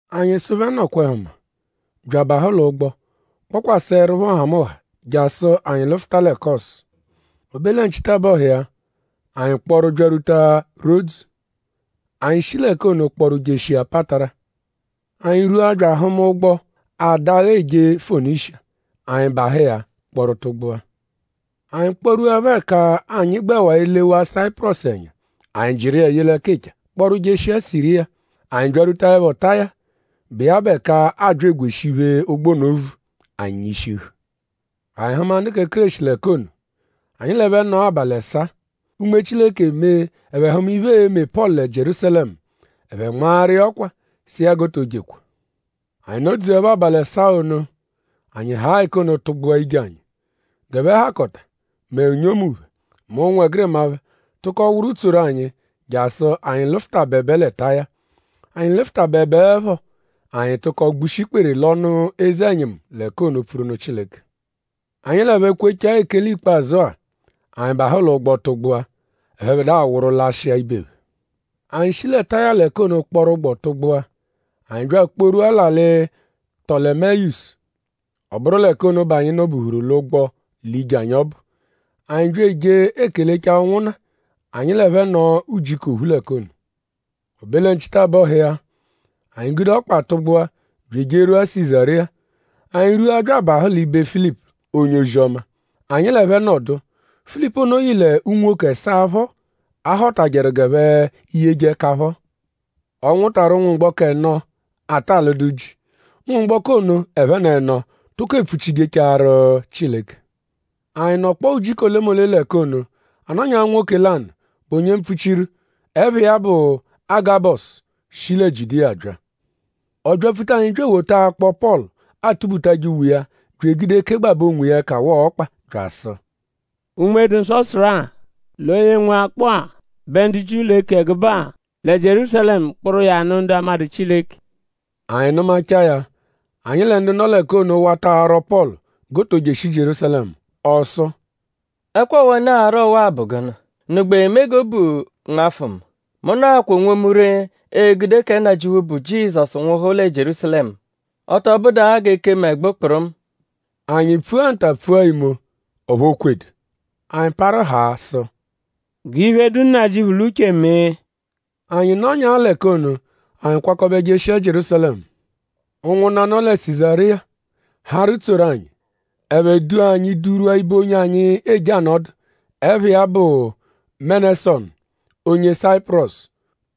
Anyi sụ phẹ: “Nọkwa-ẹhu mma” bya abahụ l'ụgbo kpọkwaseerupho nhamụnha jasụ anyi lụfuta lẹ Kọsu. O be lẹ nchitabọhu iya; anyi kpọru byarwuta Rodzu. Anyi shi l'ẹka ono kpọru jeshia Patara. Anyi rwua bya ahụma ụgbo, adagha eje Fonishiya. Anyi bahụ iya kpọru tụgbua. Anyi kpọ-rwuẹpho ẹka anyi gbẹwaa elewaa Sayipurọsu ẹnya; anyi jịru iya ye l'ẹkicha kpọru jeshia Siriya. Anyi byarwutaẹpho Taya, bụ iya bụ ẹka aabya egweshi iphe, ụgbo ono vu; anyi nyishihu. Anyi hụma ndu kẹ Kéreshi l'ẹka ono. Anyi l'ẹphe nọo abalị ẹsaa. Unme Chileke mee ẹphe hụma iphe, e-me Pọlu lẹ Jierúsalẹmu. Ẹphe nmaaru iya ọkwa sụ iya g'o to jekwa. Anyi nọdzuepho abalị ẹsaa ono; anyi haa ẹka ono tụgbua ije anyi. G'ẹphe hakọta; mẹ unyomu phẹ; mẹ ụnwegirima phẹ tụko wụru tsoru anyi jasụ anyi lụfutabebe lẹ Taya. Anyi lụfutabebeepho; anyi tụko gbushi ikpere l'ọnu eze-ẹnyimu l'ẹka ono pfuru nụ Chileke. Anyi l'ẹphe kwechaa ekele ikpazụ-a; anyi bahụ l'ụgbo tụgbua. Ẹphebedua wụru lashịa ibe phẹ. Anyi shi lẹ Taya l'ẹka ono kpọru ụgbo tụgbua. Anyi bya akpọrwua l'alị Tọlemeyisu. Ọ bụru l'ẹka ono bẹ anyi nọ-buhuru l'ụgbo l'ije anyi ọbu. Anyi bya eje ekelechaa ụnwunna; anyi l'ẹphe nọo ujiku ophu l'ẹka ono. O be lẹ nchitabọhu iya; anyi gude ọkpa tụgbua bya ejerwua Sizariya. Anyi rwua bya abahụ l'ibe Filipu, onye Ozi-ọma; anyi l'ẹphe nọdu. Filipu ono yị l'unwoke ẹsaa phọ, a họtajeru g'ẹphe yeje ẹka phọ. Ọ nwụtaru ụnwumgboko ẹno, ata alụdu ji. Ụnwumgboko ono ẹphen'ẹno tụko epfuchijechaaru Chileke. Anyi nọkpoo ujiku olemole l'ẹka ono. A nọnyaa nwoke lanụ, bụ onye mpfuchiru, ẹpha iya bụ Agabọsu shi lẹ Jiudiya bya. Ọ byapfuta anyi bya ewota akpọ, Pọlu atubutajẹ uwe iya bya egude kegbabẹ onwiya ẹka waa ọkpa bya asụ: “Unme-dụ-Nsọ sụru-a; l'onye nwe akpọ-a bẹ ndu Jiu l'e-ke ẹgube-a lẹ Jierúsalẹmu kpụru iya nụ ndu amadụ Chileke.” Anyi nụmachaa ya; anyi lẹ ndu nọ l'ẹka ono wata arwọ Pọlu g'o to jeshi Jierúsalẹmu. Ọ sụ: “?Ẹkwa ọwa, unu ara ọwa-a bụ gụnu??Unu gbẹ eme g'obu nmafụ mu? Mu nọakwaa onwomu ree egude kẹ Nnajịuphu, bụ Jizọsu nwụhu lẹ Jierúsalẹmu; ọ tọ bụdu-a g'e kee mu ẹgbu kpụrumu.” Anyi pfua nta pfua imo; ọphu o kwedu. Anyi parụ haa sụ: “G'iphe, dụ Nnajịuphu l'uche mee.” Anyi nọnyaa l'ẹka ono; anyi kwakọbe jeshia Jierúsalẹmu. Ụnwunna, nọ lẹ Sizariya harụ tsoru anyi. Ẹphe dua anyi durwua ibe onye anyi eje anọdu, ẹpha iya bụ Menesọnu onye Sayipurọsu;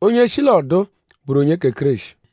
onye shi l'ọduu bụru onye kẹ Kéreshi.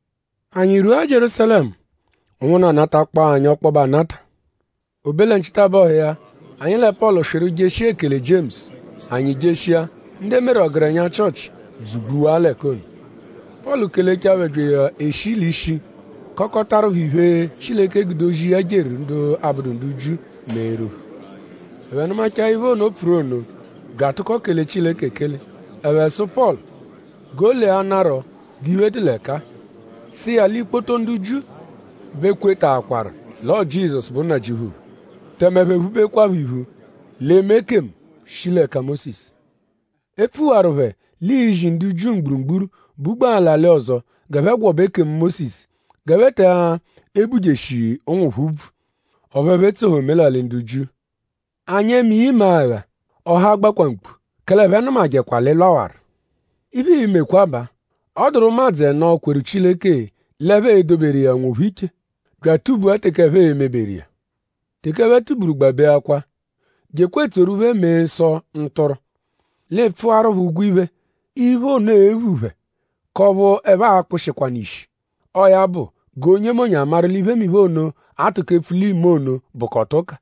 Anyi rwua Jierúsalẹmu; ụnwunna natakpọo anyi ọkpobe anata. O be lẹ nchitabọhu iya; anyi lẹ Pọlu swịru jeshia ekele Jiemusu. Anyi jeshia; ndu e meru ọgerenya Chịochi dzugbuwaa l'ẹka ono. Pọlu kelechaa phẹ bya eshi l'ishi kọkotaru phẹ iphe, Chileke gude ozi, ya jeru ndu abụdu ndu Jiu meeru phẹ. Ẹphe nụmachaa iphe ono, o pfuru ono bya atụko kele Chileke ekele. Ẹphe sụ Pọlu g'o leanarọ g'iphe dụ l'ẹka-a. Sụ iya l'ikpoto ndu Jiu bẹ kwetaakwaru l'ọo Jizọsu bụ Nnajịuphu phẹ; tẹme ẹphe phubekwaphọ iphu l'eme ekemu, shi l'ẹka Mósisu. E pfuwaru phẹ l'iizi ndu Jiu mgburugburu, bugbaa l'alị ọzo g'ẹphe gwọbe ekemu Mósisu; g'ẹphe te ebujeshi ụnwu phẹ úbvù; ọphu ẹphe etsohẹ omelalị ndu Jiu. ?Anyi e-me iya imagha? Ọha a-gbakwa mkpu. Kẹle ẹphe nụmajekwa l'ị lwawaru. Iphe, ii-mekwa baa; ọ dụru ụmadzu ẹno, kweru Chileke l'ẹphe edoberu iya onwophẹ iche; bya atụ-bua teke ẹphe e-meberu iya. Teke ẹphe tuburu gbabeakwaa. Jekwa etsoru phẹ mee nsọ, ntụrwu. L'ị pfụaru phẹ ụgwo iphe, iphe ono e-phu phẹ k'ọphu ẹphe a-kpụshikwanu ishi. Ọo ya bụ g'onyemonye amaru l'iphemiphe ono, a tụko epfu l'iime ono bụkota ụka.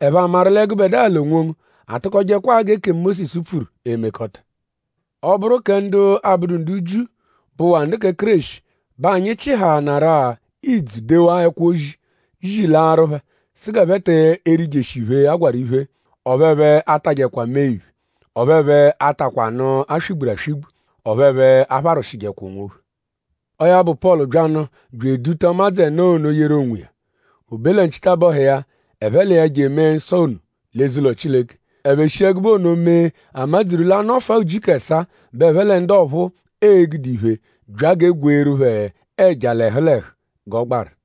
Ẹphe amaru lẹ gụbedua l'onwongu atụkojekwaa g'ekemu Mósisu pfuru emekọta. Ọ -bụru kẹ ndu abụdu ndu Jiu, bụwaa ndu kẹ Kéreshi bẹ anyi chịhaanaru-a idzu dewaa ẹkwo-ozi zilaarụ phẹ sụ g'ẹphe te erijeshi iphe, a gwarụ iphe. Ọphu ẹphe atajẹkwa mee-iphe. Ọphu ẹphe atakwa anụ, a swị-gburu aswị-gbu. Ọphu ẹphe apharwụshijekwa onwophẹ. Ọo ya bụ; Pọlu byanụ bya eduta ụmadzu ẹno ono yeru onwiya. O be lẹ nchitabọhu iya; ẹphe l'iya je emee nsọ ono l'eze-ụlo Chileke. Ẹphe shi ẹgube ono mee a madzuru l'a -nọfua ujiku ẹsaa bẹ ẹphe lẹ ndu ọphuu e-gude iphe bya g'e gweeru phẹ ẹja l'ẹhu l'ẹhu g'ọ gbaru.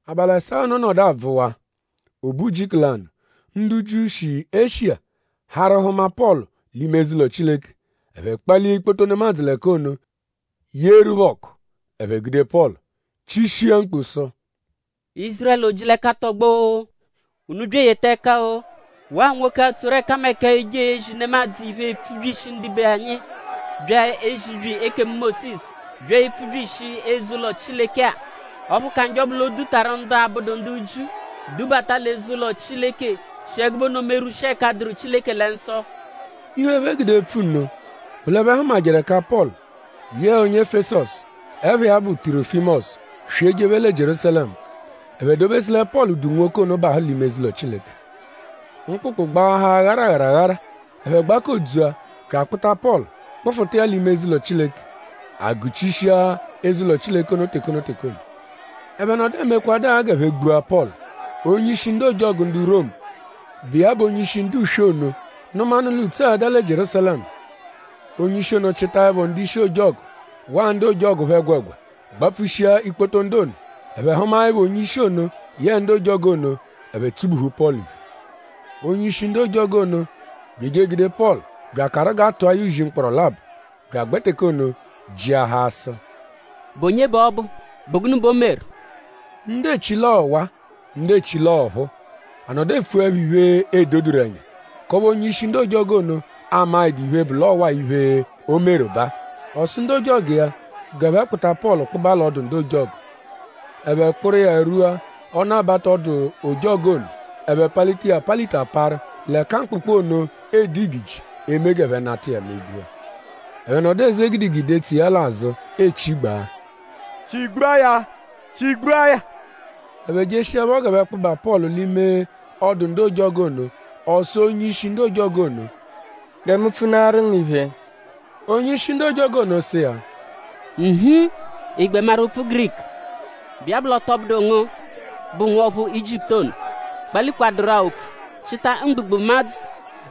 Abalị ẹsaa ono nọdu abvụwaa. O be ujiku lanụ; ndu Jiu, shi Eshiya harụ hụma Pọlu l'ime eze-ụlo Chileke. Ẹphe kpalia ikpoto nemadzụ l'ẹka ono; yeeru phẹ ọku; ẹphe gude Pọlu chishia mkpu sụ: “Ízurẹlu! O-ji-l'ẹka tọgbo-o! Unu bya eyeta ẹka-o! Waa nwoke-a, tsoru ẹkameka eje ezi nemadzụ iphe; epfubyishi ndibe anyi bya ezibyi ekemu Mósisu bya epfubyishi eze-ụlo Chileke-a. Ọphu ka njọ bụ l'o dutaru ndu abụdu ndu Jiu dubata l'eze-ụlo Chileke shi ẹgube ono merwushia ẹka dụru Chileke lẹ nsọ.” Iphe, ẹphe gude epfu nno bụ l'ẹphe hụmajeru ẹka Pọlu yẹe onye Efesọsu, ẹpha iya bụ Tirọfimosu swị ejephe lẹ Jierúsalẹmu. Ẹphe dobesu lẹ Pọlu du nwoke ono bahụ l'ime eze-ụlo Chileke. Mkpụkpu gbaahaa gharagharaghara. Ẹphe gbakodzua bya akpụta Pọlu kpụfuta iya l'ime eze-ụlo Chileke. A gụchishia eze-ụlo Chileke ono teke ono teke ono. Ẹphe nọdu emekwadụ-a g'ẹphe gbua Pọlu; onye-ishi ndu ojọgu ndu Romu, bụ iya bụ onye-ishi ndu uswe iya ono nụmanu l'ùtsú ada lẹ Jierúsalẹmu. Onye-ishi ono chịtaepho ndu-ishi ojọgu waa ndu ojọgu phẹ ẹgwegwa gbapfushia ikpoto ndu ono. Ẹphe hụmaepho onye-ishi ono yẹe ndu ojọgu ono; ẹphe tsubuhu Pọlu iphe. Onye-ishi ndu ojọgu ono bya eje egude Pọlu bya akarụ g'a tụa ya uzi mkpọro labọ. Bya agbẹ teke ono jịahaa sụ: “?Bụ onye bẹ ọ bụ??Bụ gụnu bẹ o meru?” Ndu echi l'o meru ọwa; ndu echi l'ọo ọphuu. A nọdu epfuẹpho iphe, edoduru ẹnya k'ọphu onye-ishi ndu ojọgu ono amaẹdu iphe, bụ l'ọo waa iphe, o meru baa. Ọ sụ ndu ojọgu iya g'ẹphe kpụta Pọlu kpụba l'ọdu ndu ojọgu. Ẹphe kpụru iya rwua ọnu-abata ọdu-ojọgu ono; ẹphe palita iya apalita parụ; l'ẹka mkpụkpu ono ede igiji eme g'ẹphe nata iya megbua. Ẹphe nọdu eze gidigidi etso iya l'azụ echigbaa: “Chigbua ya! Chigbua ya!” Ẹphe jeshiẹpho g'ẹphe kpụba Pọlu l'ime ọdu ndu ojọgu ono; ọ sụ onye-ishi ndu ojọgu ono: “Gẹ mu pfunaaru ngu iphe.” Onye-ishi ndu ojọgu ono sụ iya: “Inhi!?Ị gbẹ maru opfu Giriku? ?Bụ iya bụ l'ọ tọ bụdu ngu bụ nwọphu Ijiputu ono, kpalikwadụru-a opfu; chịta mgbugbụmadzu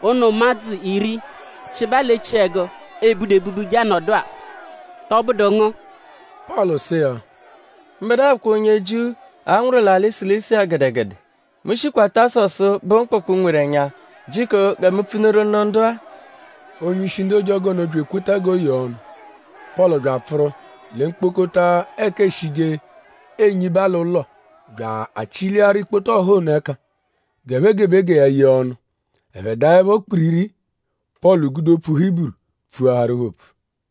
ụnu ụmadzu iri, chịba l'echiẹgu, e budu ebubu je anọdu-a?” “?Tọbudu ngu?” Pọlu sụ iya: “Mbẹdua bụkwa onye Jiu, a nwụru l'alị Silisiya gẹdegede. Mu shikwa Tasọsu, bụ mkpụkpu nweru ẹnya. Jiko gẹ mu pfunuru nụ ndu-a.” Onye-ishi ndu ojọgu ono bya ekweta g'o yee ọnu. Pọlu bya apfụru lẹ mkpokota ẹka eeshije enyiba l'ụlo bya achị-liaru ikpoto ọha ono ẹka g'e gebe gẹ ya yee ọnu. Ẹphe daẹpho kpiriri; Pọlu gude opfu Hiburu pfuaharu phẹ opfu: